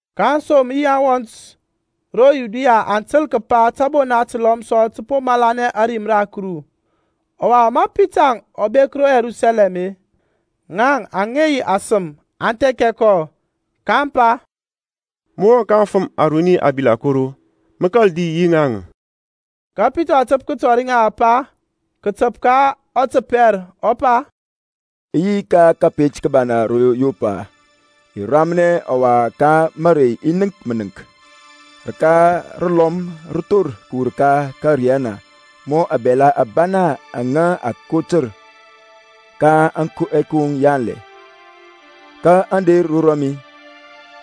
Ka aŋsom yi aŋwɔnt ro Yudia aŋ təl kəpa tȧbona təlɔm sɔ tə po malanɛ ȧrim ra Kuru. Ɔwa ma Pitaŋ ɔ bek ro Yerusalɛm-e, ŋaŋ aŋa yi asema aŋ thɛkɛ kɔ, kaŋ pa, Mə wɔŋ ka aŋfəm aruni aŋbilakoro, mə kȧl di yi ŋaŋ. Ka Pitaŋ ɔ təp kətɔri ŋa ȧŋpa kətəp ka ɔtəpɛr, ɔ pa, I yi ka kȧpet ka ro Yɔpa, i ramnɛ; ɔwa ka marey i nənk mənəŋk, rəka rəlɔm rə thor kəwur ka ȧkȧriyana mɔ abɛla abana aŋa a kotər ka ɛkoŋ yanlɛ, ka aŋ der ro rɔmi.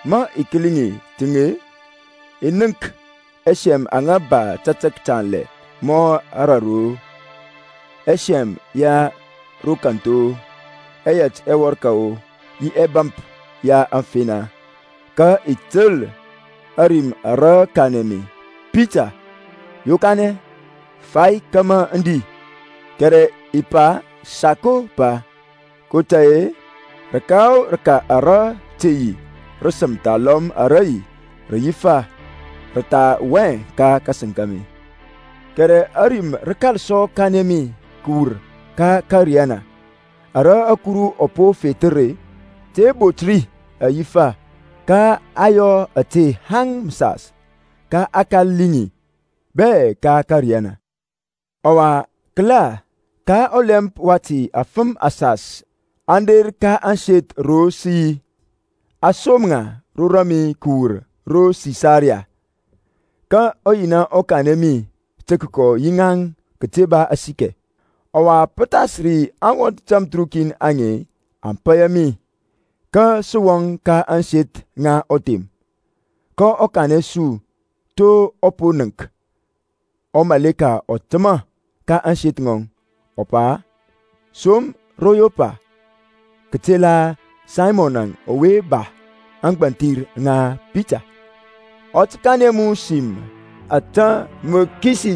Ma i kəli ŋi təŋ-e, i nənk ɛsɛm aŋa ba tatək tanlɛ ma raru-o, ɛsɛm ya ro kȧnth-o, ɛyɛt ɛwɔrkȧ-o, yi ɛbȧmp ya ȧŋfena. Kȧ i təl ȧrim ara kanɛ mi, Pita yokanɛ, fai kȧmȧ mə di. Kɛrɛ i pa, Sako Pa, kotȧy-e rəka o rəka ara te yi rəsəm thalɔm ara yi rəyifa rə tha wɔŋ hɛ ka kȧsəŋ kȧmi. Kɛrɛ ȧrim rə kȧl sɔ kanɛ mi kəwur ka ȧkȧriyana, Ara Kuru ɔ po fethər-e, te bont ri rəyifa. Ka a yɔ ȧte haŋ məsas, ka a kȧl liŋ ŋi bɛ ka ȧkȧriyana. Ɔwa kəla, ka ɔlɛmp wati afəm asas aŋ der ka ȧŋseth ro sə yi, a som ŋa ro rɔmi kəwur ro Sisaria. Ka ɔYina ɔ kanɛ mi tə kəkɔ yi ŋaŋ kəte ba asikɛ. Ɔwa pə thas ri aŋwɔnt tamthərukin aŋe aŋ paya mi, ka sə wɔŋ ka ȧŋseth ŋa ɔthem. kɔ kanɛ su to ɔ po nənk ɔmaleka ɔ təmȧ ka ȧŋseth ŋɔŋ, ɔ pa, Som ro Yɔpa kətela Saymɔn ɔwe ba ȧŋgbȧnthir ŋa Pita; ɔ tə kanɛ mu sim ka ȧtȧ mȧ mə kisi,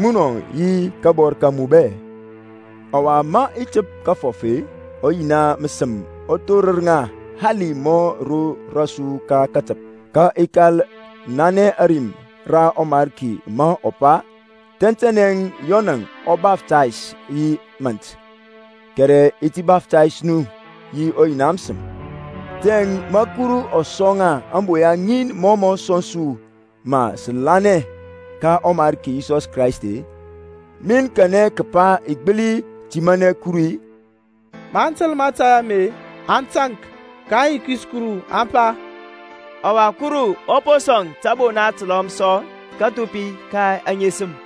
munɔ yi kabɔr ka mu bɛ. Ɔwa, ma i təp kəfɔf-e, ɔYina məsəm ɔ thorər ŋa hali mɔ ro rɔsu ka katəp. Ka i kȧl nanɛ ȧrim ra ɔMarki ma ɔ pa, Tɛntɛnɛ Yɔnȧŋ ɔ baftays yi mȧnt, kɛrɛ a tə baftays nu yi ɔYina məsəm. Tiyȧŋ ma Kuru ɔ sɔŋ ŋa ȧŋboya ŋin mɔ mɔ sɔŋ su ma sə lanɛ ka ɔMarki Yisɔs Kraist-e, min kanɛ kəpa i gbəli timanɛ Kuru-i? Maŋ təl mȧtȧy ame-e, aŋ taŋk, kaŋ yikis Kuru, aŋ pa, Ɔwa Kuru ɔ po sɔŋ tȧbona təlɔm sɔ kathupi ka aŋesəm.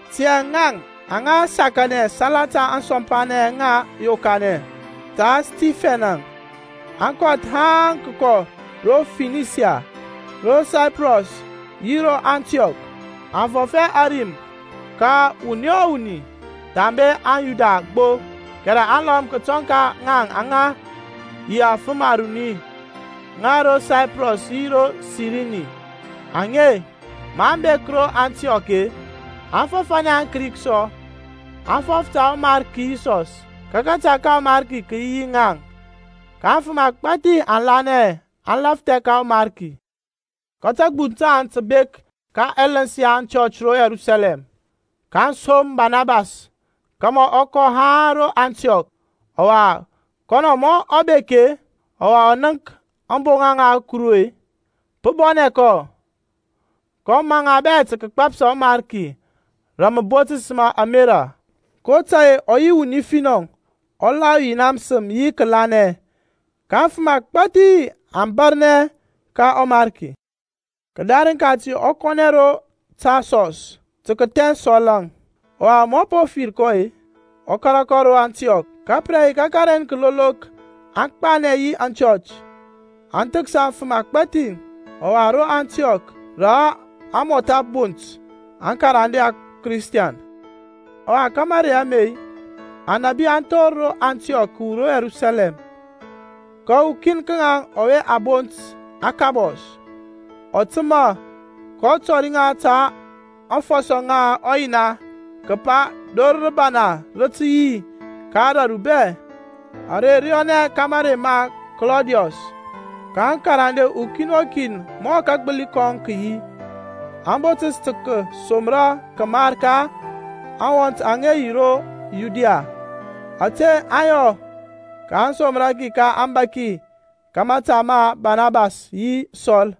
Tiyȧŋ ŋaŋ aŋa sakanɛ salata ȧŋsɔmpanɛŋ aŋa yokanɛ ta Stifɛn-əŋ aŋ kɔth haŋ kəkɔ ro Finisia, ro Saiprɔs yi ro Antiɔk, aŋ fɔf hɛ ȧrim ka wuni o wuni thambe aŋ Yuda gbo. Kɛrɛ aŋlɔm kətɔŋ ka ŋaŋ aŋ yi afəm aruni ŋa ro Saiprɔs yi ro Sirini. Aŋe, maŋ bek ro Antiɔk-e, aŋ fɔfȧnɛ aŋKrik sɔ, aŋ fɔf ta ɔMarki Yisɔs. Ka kȧta ka ɔMarki kə yi yi ŋaŋ, ka afəm agbȧthi aŋ lanɛ aŋ lafthɛ ka ɔMarki. Ka tȧgbuŋ taŋ tə bek ka ɛləns ya aŋchɔch ro Yerusalɛm, kaŋ som Barnabas kȧmȧ ɔ kɔ haŋ ro Antiɔk. Ɔwa kɔnɔ ma ɔ bek-e, ɔwa ɔ nənk ȧŋboŋa ŋa Kuru-e, pə bɔnɛ kɔ. Kɔ maŋ ŋa bɛ tə kəgbȧpsȧ ɔMarki rə məbotəs ma ȧmerȧ. kotȧy-e ɔ yi wuni finɔ, ɔ la ɔYina məsəm yi kəlanɛ; ka afəm agbȧthi aŋ bȧrnɛ ka ɔMarki. Kədarəŋ kati ɔ kɔnɛ ro Tarsɔs tə kəthɛns Sɔl-əŋ. Ɔwa ma ɔ po fir kɔ-e ɔ kȧrȧ kɔ ro Antiɔk. Ka pə re yi ka kəren kəlolok aŋ gbanɛ yi aŋchɔch, aŋ thəksa afəm agbȧthi. Ɔwa ro Antiɔk, rə a mɔtha bont aŋkarande aKristiɛn. Ɔwa ka marey ame anȧbi aŋ thor ro Antiɔk kəwur ro Yerusalɛm. Ka ukin ka ŋaŋ ɔwe a bont Akabɔs, ɔ təmȧ, kɔ tɔri ŋa ka aŋfɔsɔ ŋa ɔYina kəpa dor rəbana rə tə yi ka ȧdȧru bɛ; are rə yɔnɛ ka marey ma Klɔdiɔs. Ka aŋkarande, ukin o kin mɔ kagbəli kɔŋ kə yi, aŋ botəs tə kəsomra kəmar ka aŋwɔnt aŋa yi ro Yudia. Ȧte aŋ yɔ, kaŋ somra ki ka aŋbȧki ka mȧta ma Barnabas yi Sɔl.